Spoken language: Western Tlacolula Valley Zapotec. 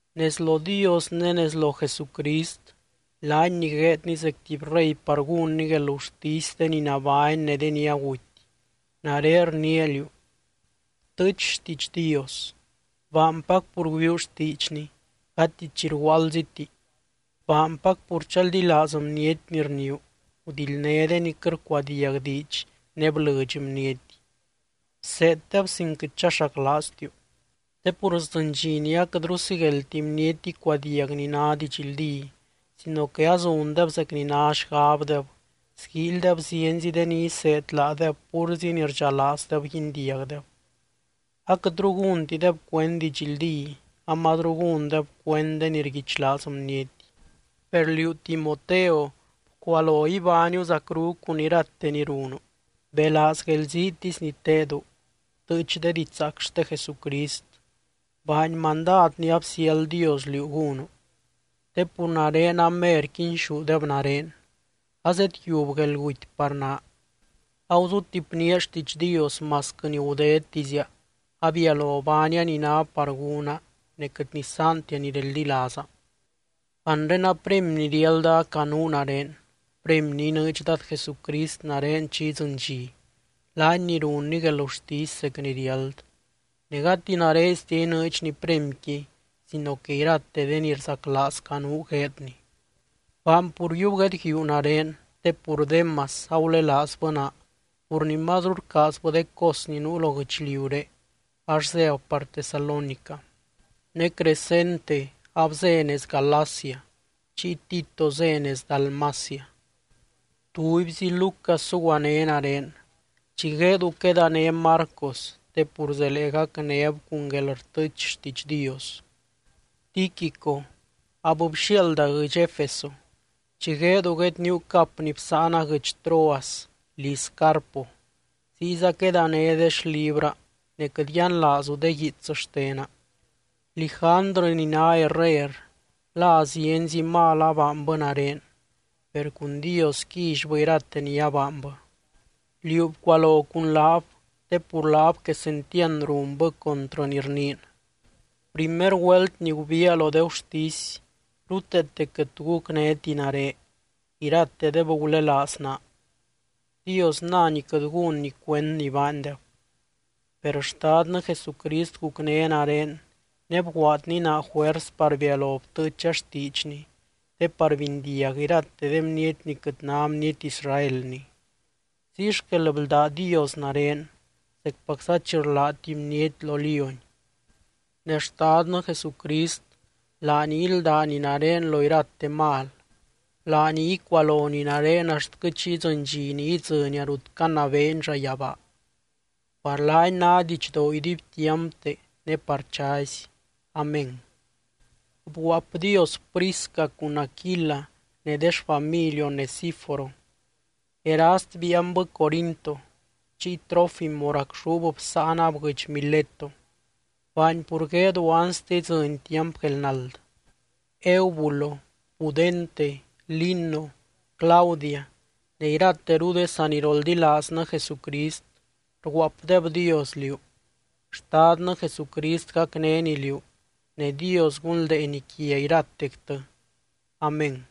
Nez lo Dios ne nez lo Jesucrist, laany ni gueedny zec tuby rey par gúnny guelgurtisy de ni nabány ne de ni aguty, nare rniia liú: Btɨɨch xtiidx Dios. Baanpac pur güiuu xtiidxny, gati chi rguaaldziti. Baanpac pur chaldilaaz bniety ni rniiu, gudildné de ni quɨt rcuadiag diidx ne blɨdx bniety, bseeddeb sin quɨt chaxaclaaztiu. Te pur sdzɨny dxi ni aquɨtru sigueldti bniety icuadiag ni ná didxldí, sino que azundeb zec ni ná xgabdeb, sguíilydeb zienzi de ni iseed laadeb púrzi ni rdxalaazdeb guindiagdeb. Aquɨtru gúntideb cuend didxldí, amazru gúndeb cuend de ni rguichlaaz bniety. Per liú Timoteo, bcualo ibániu zacru cun irate ni runu, belaaz guelziitisy ni tedu, btɨɨch de didxzaac xte Jesucrist, baany mandad ni absiáld Dios liú gúnu. Te pur nare amer quinxúdeb nare, azedyiub guelguty par naa. Aguzutipnía xtiidx Dios masquɨ ni gudedtizia, abialo baania ni ná par gúna ne quɨt nisaantia ni reldilaaza. Anre a premy ni riálda acanuu nare, premy ni inɨɨdx Dad Jesucrist nare chi idzɨny dxi, laany ni runny guelgurtisy zec ni riáld. Ne gati nareztia inɨɨdxny premyqui, sino que irate de ni rzaclaaz canuu gueedny. Baany pur yiub guedguíu nare, te pur Démas agulelaazbɨ naa pur ni mazru rcaazbɨ de cos ni nuu lo guɨchliuré, ax zéb par Tesalónica. Ne Crescente abzé nez Galacia chiy Tito zé nez Dalmacia. Tubyzi Lucas zuguané nare. Chi gueedu quedané Marcos te pur zelee gacnéb cun guelrtɨɨch xtiidx Dios. Tíquico abbxiaalda guɨdx Efeso. Chi gueedu guedníu cap ni bsáana guɨdx Troas liz Carpo, ziyza quedané de xlibraa ne quɨt yianlaazu de guiits xtena. Lijandrɨ ni ná herrer, la zienzi mal abaanbɨ nare, per cun Dios quillybɨ irate ni abaanbɨ. Liú bcualo cun laab, te pur laab quesentiand runbɨ contrɨ ni rniin. Primer güelt ni gubiia lo de gurtisy ruteete quɨt tu gucnéti nare, iratedeb gulelaaz naa. Dios nany quɨt gúnny cuend ni baandeb. Per Xtadnɨ Jesucrist gucné nare ne bguaadny naa juers par bialo btɨɨcha xtiidxny, te par bindiag irate de bniety ni quɨt ná bniety Israelni. Ziy xquel bldá Dios nare, zecpacza chi rlá tuby bniety lo lióny. Ne Xtadnɨ Jesucrist, laany íldany nare lo irate mal, laany icualony nare axtquɨ chi idzɨny dxi ni idzɨnia rut canabeeny llayabaa. ¡Par laany ná didxdoo iduibtiampte ne par chazy! Amén. Bguaapdios Prisca cun Aquila ne de xfamily Onesíforo. Erast biianbɨ Corinto, chiy Trófimo racxúb bsáanab guɨdx Mileto. Baany pur gueedu anste idzɨny tiamp guelnald. Eubulo, Pudente, Lino, Claudia ne irateru de saniroldilaaznɨ Jesucrist rguaapdebdios liú. Xtadnɨ Jesucrist gacnény liú, ne Dios gunldeeny quia iratectɨ. Amén.